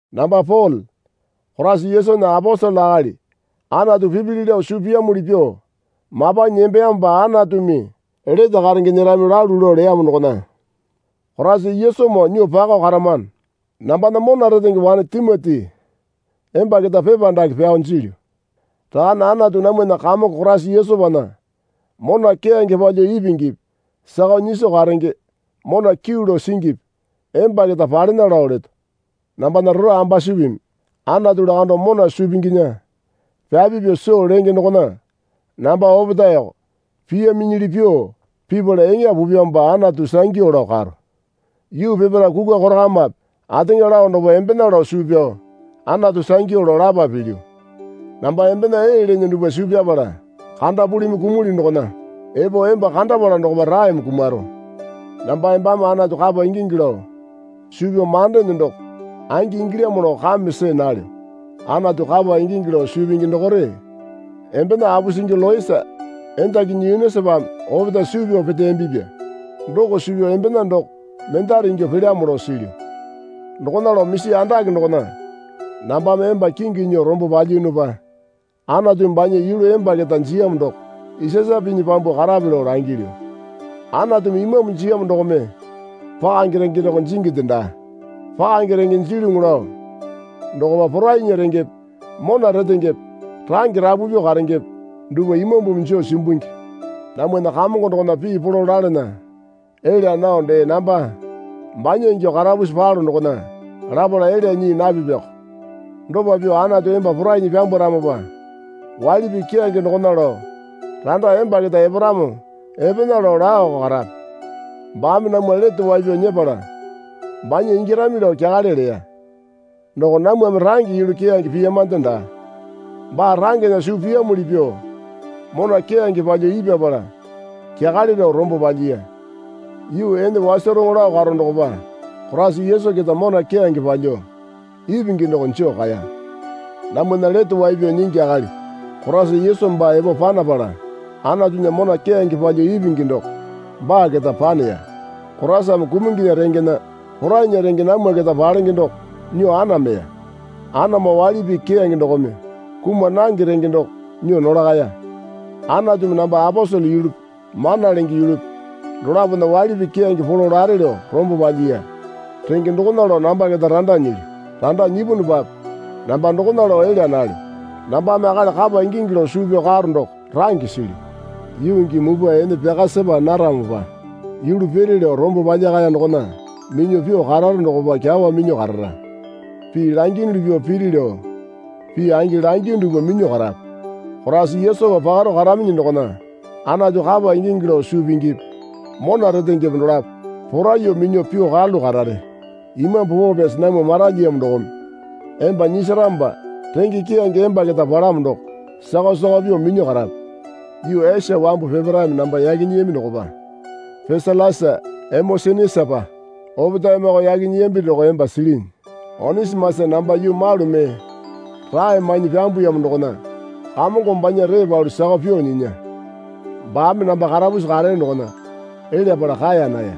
Namba Pole Koraisa Yesunya aposele akali Anatu pipili lao suu piyamuli pyuo mapanyi nembeyamopa Anatumi lete karenge nyerami lalu lao leyamo dokona Koraisa Yesumoo nyuo pakao karamano. Nambana mona retenge wane Timoti emba keta pepa dake pyao jilyu. Rakane Anatu namwana Kamongo Koraisa Yesupana mona keyange palyuo ipingipi sakao nyiso karenge mona kyuu lao singipi emba keta palena lao leto. Nambana rora ambasupimi Anatu lakando mona suu pinginya pyapi pyuo soo lenge dokona namba opetaeko piyaminyili pyuo pipala eŋa pupyamopa Anatu sangyu lao karo. Yuu peparae kukwa korakamape ateŋa lao dokopa embena lao suu pyao Anatu sangyu lao lapa pilyu. Namba embena ee leene dupwa suu pyapala kandapulimi kumulyu dokona epo emba kandapala dokopa raeme kumaro. Namba embame Anatu kapa ingingi lao suu pyao mandeene doko angi ingilyamo lao kame see nalyo. Anatu kapa ingingi lao suu pingi dokore embena apusingi Loisa endakinyi Yunisapame opetae suu pyao peteyambipya. Doko suu pyao embena doko mendare ingyuo pelyamo lao silyu. Dokona lao misi andake dokona nambame emba kingi nyuo rombo palyiyunupa Anatumi banya yulu emba keta jiyamo doko isasa pinyi pyambuo karape lao langilyu. Anatumi Imambu jiyamo dokome pakange renge doko jinginde daa. Pakange renge jilyuŋi lao dokopa porainya rengepe mona retengepe range rapu pyuo karengepe dupwa Imambumi joo simbungi. Namwana Kamongo dokona pii polo lalana elya nao dee namba banya ingyuo karapusi palo dokona lapala elya nyii napipiyoko. Dopa pyuo Anatu emba porainyi pyambwaramopa waili pii keyange dokona lao randa emba keta eparamo epena rao laoko karape. Baame namwa lete wai pyao nyepala banya ingyarami lao kyakale leya. Doko namwame range yulu keyange piyamande daa. Baa rangena suu piyamuli pyuo mona keyange palyuo ipyapala kyakale lao rombo palyiya. Yuu ene wasaroŋo lao karo dokopa Koraisa Yesu keta mona keyange palyuo ipingi doko joo kaeya. Namwana Lete Wai Pyao Nyingi akali Koraisa Yesu baa epo panapala Anatunya mona keyange palyuo ipingi doko baa keta paneya. Koraisame kumunginya rengena porainya renge namwa keta palenge doko nyuo anameya. Anamo waili pii keyange dokome kuma nange renge doko nyuo nolakaya. Anatumi namba aposele yulupi mana lenge yulupi dolapona waili pii keyange polo lare lao rombo palyiya. Renge dokona lao namba keta randa nyilyu. Randa nyipunupape namba dokona lao elya nalyo. Nambame akali kapa ingingi lao suu pyao karo doko range silyu. Yuu gii mupwa ene pyaka sepa naramopa yulu piri lao rombo palyakaya dokona minyuo pyuo kararo dokopa kyawa minyuo karara. Pii langiyunuli pyuo piri lao pii angi langiyu dupwa minyuo karape. Koraisa Yesupa pakaro karaminyi dokona Anatu kapa ingingi lao suu pingipi mona retengepe dolapo poraiyuo minyuo pyuo karalu karare. Imambu Poo Pyasi namwa maralyiyamo dokome emba nyisaramopa renge keyange emba keta palamo doko sakao sakao pyuo minyuo karape. Yuu Esia wambu peparaeme namba yaki nyiyami dokopa Piselasa Emosenisapa opetaemeko yaki nyiyambi doko emba silinyi. Onisimasa namba yuu malu mee rae mainyi pyambuyamo dokona Kamongome banya ree palu sakao pyuo nyinya. Baame namba karapusi kareyo dokona elyapala kaeya naya.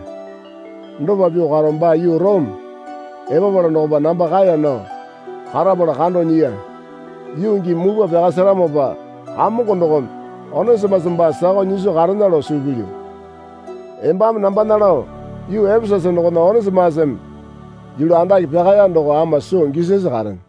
Dopa pyuo karo baa yuu Orome epapala dokopa namba kaeya nao karapala kando nyiya. Yuu gii mupwa pyaka seramopa Kamongo dokome Onisimasa baa sakao nyiso karena lao suu pilyu. Embame nambana lao yuu Epesasa dokona Onisimasame yulu andake pyakaya doko ama soo gisasi karene.